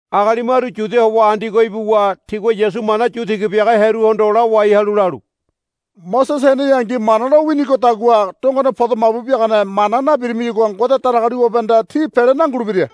Agali maru Yudia howa Andiogo ibuwa tigua Yasu mana yu tiga biaga hearuhondo lawai halu lalu. Mosese heneyangi Mana lo winigodagua dongone podo mabu biagane mana nabirimiyagua Ngode Datagaliwabehanda tí pele nangulebira,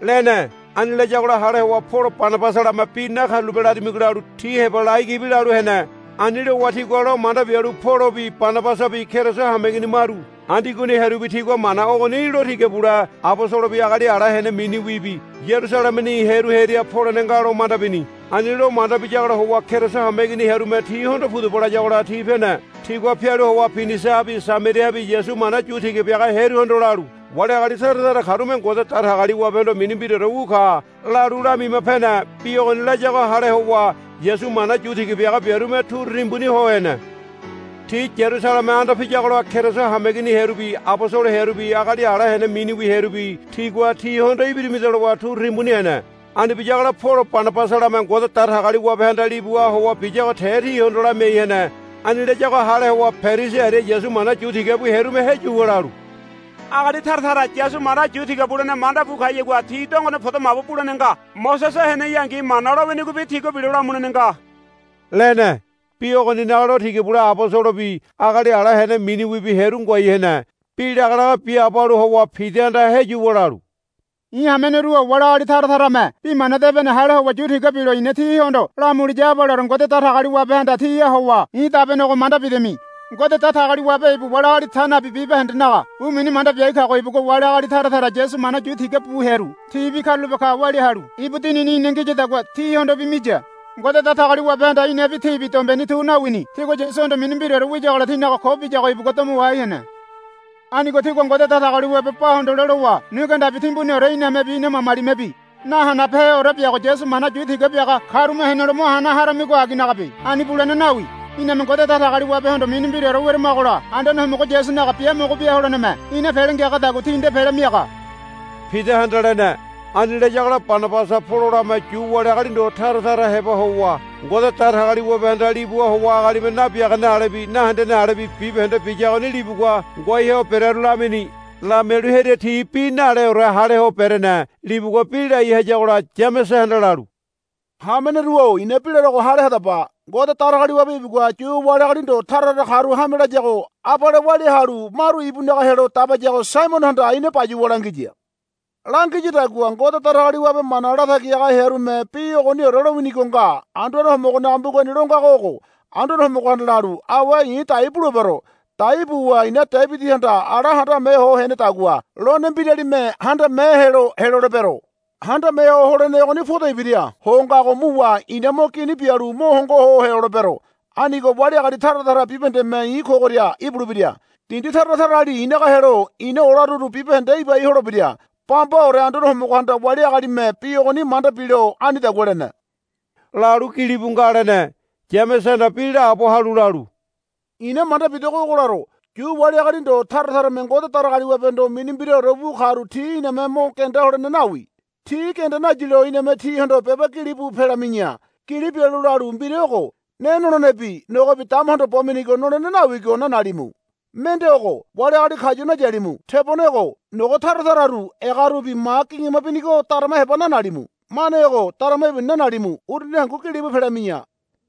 lene. Ani layagola hale howa Polo Banabasalame, Bi nakarulape larimigo, lalu ti heba lai gibi lalu hene. Ani lowa tigua lo manda bialu Polobi Banabasabi Keriso hameigini maru Andiogoni hearubi tigua mana ogoni lo tiga bule abosolobi agali ala hene miniwibi Yarusalemeni hearu hearia polene nga lo manda bini. Ani lo manda biyagola howa Keriso hameigini hearume tihondo, Pudaba, layagola ti pene. Tigua pialu howa Pinisiahabi Samariahabi Yasu mana yu tiga biaga hearuhondo lalu, Wali agali tara tara karume Ngode Datagaliwabehondo mini mbiraore wu ka, lalu lamima pene. Bi ogoni layago hale howa Yasu mana yu tiga biaga biarume turu timbuni ho hene. Ti Yarusaleme anda piyagola Keriso hameigini hearubi abosolo hearubi agali ala hene miniwi hearubi tigua tihondo, Ibirimida, lowa turu timbuni hene. Ani biyagola Polo Banabasalame Ngode Datagaliwabehanda libuha howa biyago te tihondo lamiai hene. Ani layago hale howa Perisi aria Yasu mana yu tiga bu hearume heyuwa lalu, Agali tara tara Yasu mana yu tiga bulene manda bu kayagua ti dongone podo mabu bulene nga. Mosese heneyangi Mana lo winigobi tigua bilo lamulene nga, lene. Bi ogoninaga lo tiga bule abosolobi agali ala hene miniwibi hearu ngoai hene. Bi lagalaga biaabo halu howa Pidahanda heyuwa lalu, I̱ hameneru-o wali agali tara tarame Bi Mana Debene hale howa yu tiga bilo i̱na tihondo lamuliya abaleore Ngode Datagaliwabehanda tíha howa i̱ dabenego manda bidami. Ngode Datagaliwabe ibu wali agali ta nabi bibahendenaga bu mini manda biai kago ibugua wali agali tara tara Yasu mana yu tiga bu hearu tibi karulape ka walia halu ibu Dinini ina ngiyadagua tihondobi miya. Ngode Datagaliwabehanda inabi tibi dombeni tu nawini. Tigua Yasuhondo mini mbiraore wiyagola tinaga ko biyago ibugua domo wahai hene. Anigo tígua Ngode Datagaliwabe ba hondole lowa nu genda timbuniore inamebi ina mamalimebi nahanabeheore biago Yasu mana yu tiga biaga karume henelo mo hana haramigo aginagabe. Ani bulene nawi. Iname Ngode Datagaliwabehondo mini mbiraore weramagola Anduane Homogo Yasunaga biamogo bia holeneme ina pele ngiagadagua ti nde pele miaga, Pidahanda lene. Ani layagola Banabasa Pololame Yu wali agali ndo tara tara heba howa Ngode Datagaliwabehanda libuha howa agalime nabiagane alebi nahendene alebi bibahende biyagoni libugua ngoai ho berearu lamini. Lamialu hearia ti bi naleore haleho berene. Libugua bi lai hayagola Yamesehanda lalu, Hameneru-o i̱na bi larogo hale hadaba. Ngode Datagaliwabe ibugua Yu wali agali ndo tara tara karu hame layago abale walia halu maru ibunaga helo dabayago Saimonohanda ina bayuwa langiya. Langiyadagua Ngode Datagaliwabe mana latagi haga hearume bi ogoniore lowinigo nga. Anduane Homogonaga mbugani lo ngago ogo, Anduane Homogohanda lalu, Awe i̱ dai bulebero. Dai buwa i̱na Debidihanda ala handame ho henedagua lone mbiralime handame helo helolebero. Handame ho holene ogoni podo ibira ho ngago muwa i̱na mo gini bialu mo hongo ho helolebero. Anigo wali agali tara tara bibahendeme i̱ kogoria ibulebira. Dindi tara tarali i̱naga helo i̱na olaruru bibahende ibai holebira. Bambaore Anduane Homogohanda wali agalime bi ogoni manda bilo anidagua lene, lalu, gilibu nga, lene. Yamesehanda bi laabo halu lalu, I̱na manda bidogo ogo laro. Yu wali agali ndo tara tarame Ngode Datagaliwabehondo mini mbiraore wu karu ti iname mo genda holene nawi. Ti genda nayilo iname tihondo beba gilibu pelami̱ya. Gili bialu lalu, Mbira ogo, Ne nolenebi nogobi damahondo bo minigo nolene nawigo nanalimu. Mende ogo, Wali agali kayu nayalimu. Tebone ogo, Nogo tara tararu egarubi ma gingima binigo darama heba nanalimu. Mane ogo, Darama ibuni nanalimu. Uruni hangu gilibu pelami̱ya.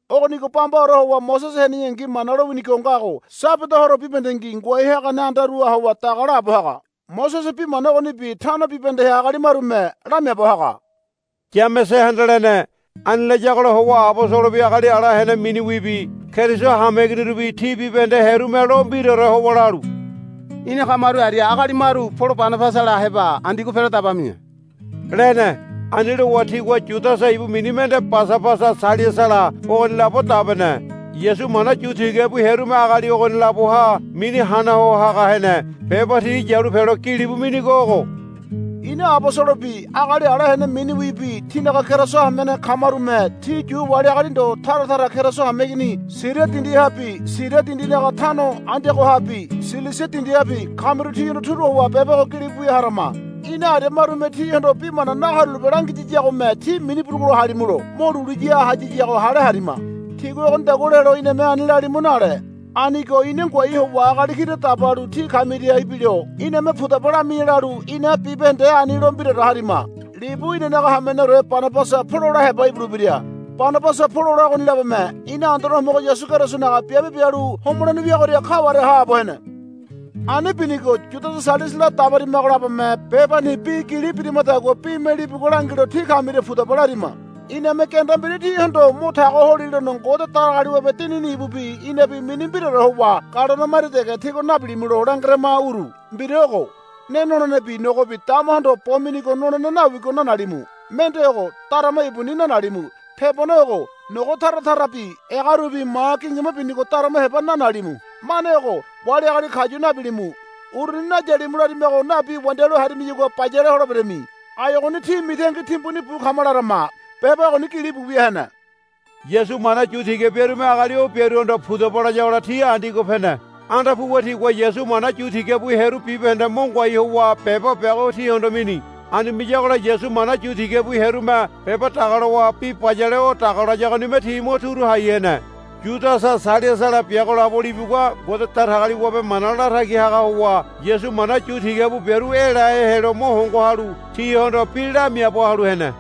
Ogonigo bambaore howa Mosese heneyangi Mana lowinigo ngago Sabada horo bibahendengi ngoai hagane andaruha howa daga laabo haga. Mosese bi mana ogonibi tano bibahendeha agali marume lamiaabo haga, Yamesehanda lene. Ani layagola howa abosolobi agali ala hene miniwibi Keriso hameiginirubi ti bibahende hearume lo mbiraore howa lalu, Ina kamaru aria agali maru Polo Banabasala heba Andiogo pelo dabami̱ya, lene. Ani lowa tigua Yudasa ibu mini mende Basabasa Sailasala ogoni labo dabene. Yasu mana yu tiga bu hearume agali ogoni laboha mini hana ho haga hene. Beba ti yalu pelo gilibu minigo ogo. Ina abosolobi agali ala hene miniwibi tínaga Keriso hamene kamarume tí Yu wali agali ndo tara tara Keriso hameigini Siria dindihabi Siria dindinaga tano Andiogohabi Silisia dindihabi kamiru tíhondo turu howa beba ogo gilibu wia harama. Ina aria marume tíhondo bi mana nakarulape langiyiyagome tí mini burugulo halimulo mo lulu ya hayiyago hale harima. Tigua ogonidagua lelo iname ani lalimu nale. Anigo ina ngoai howa agali kira dabalu tí kamiria ibilo iname, Pudaba lami̱ya, lalu ina bibahende ani lo mbiraore harima. Libu inanaga hameneore Banabasa Polola heba ibulebira. Banabasa Polola ogoni labome ina Anduane Homogo Yasu Kerisonaga biabe bialu homolene wiagoria kaware haabo hene. Ani binigo Yudasa Sailasala dabarimago labome bebani bi gili birimadagua bime libugua langilo tí kamiria, Pudaba, larima. Iname genda mbira tíhondo mo tago holilono Ngode Datagaliwabe Dinini ibubi inabi mini mbiraore howa galone maria dege tígua nabilimulo langerama uru. Mbira ogo, Ne nolenebi nogobi damahondo bo minigo nolene nawigo nanalimu. Mende ogo, Darama ibuni nanalimu. Tebone ogo, Nogo tara tarabi egarubi ma gingima binigo darama heba nanalimu. Mane ogo, Wali agali kayu nabilimu. Uruni nayalimu larimago nabi wandialu harimiyagua bayale holeberami. Ai ogoni tí mitangi timbuni bu kama larama. Beba ogoni gilibu wia hene. Yasu mana yu tiga biarume agali o biaruhondo, Pudaba, layagola ti Andiogo pene. Anda puwa tigua Yasu mana yu tiga bu hearu bibahende mo ngoai howa beba biago tihondo mini. Ani miyagola Yasu mana yu tiga bu hearume beba dagalowa bi bayale o daga layagonime ti mo turu hai hene. Yudasa Sailasala biago labo libugua Ngode Datagaliwabe mana latagi haga howa Yasu mana yu tiga bu biaru elahe helo mo hongo halu tihondo bi lamiaabo halu hene.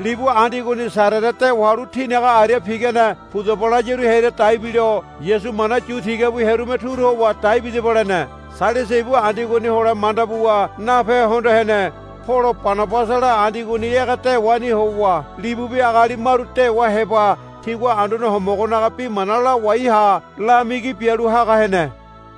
Libu Andiogoni Sarere dewa halu tinaga aria pigane, Pudaba, layaru hearia dai bilo Yasu mana yu tiga bu biarume turu howa, Dai bidaba, lene. [ Sailasa ibu Andiogoni hole manda buwa nape hondo hene.] Polo Banabasala Andiogoni ege dewani howa libubi agali maru dewa heba tigua Anduane Homogonaga bi mana lawai ha lamigi bialu haga hene.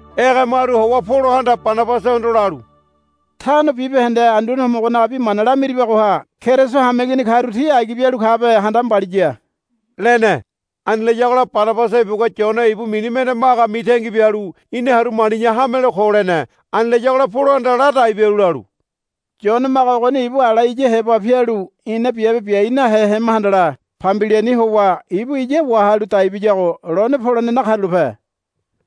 Ege maru howa Polohanda Banabasahondo lalu, Tano bibahende Anduane Homogonaga bi mana lamiribagoha Keriso hameigini karu ti agi bialu kabe handama mbaliya, lene. Ani layagola Banabasa ibugua Yone ibu mini mende Maga mitangi bialu, Ina haru mali̱ya hamelo ko, lene. Ani layagola Polohanda ladai bialu lalu, Yone Maga ogoni ibu ala iya heba pialu ina biabe biai nahe hema handala Pambiliani howa ibu iya wahalu dai biyago lone polene nakarulape,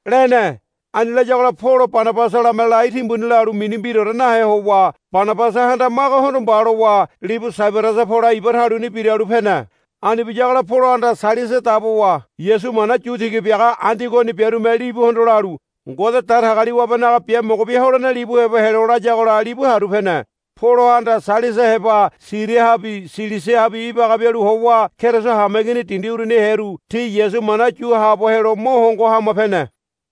lene. Ani layagola Polo Banabasalame lai timbuni lalu mini mbiraore nahe howa Banabasahanda Magahondo, Mba, lowa libu Saibarasa pole iba taluni biralu pene. Ani biyagola Polohanda Sailasa dabowa Yasu mana yu tiga biaga Andiogoni biarume libuhondo lalu, Ngode Datagaliwabenaga biamogo bia holene libu heba helo, layagola libu haru pene. Polohanda Sailasa heba Siriahabi Silisiahabi ibaga bialu howa Keriso hameigini dindi uruniha hearu ti Yasu mana yu haabo helo mo hongo hama pene.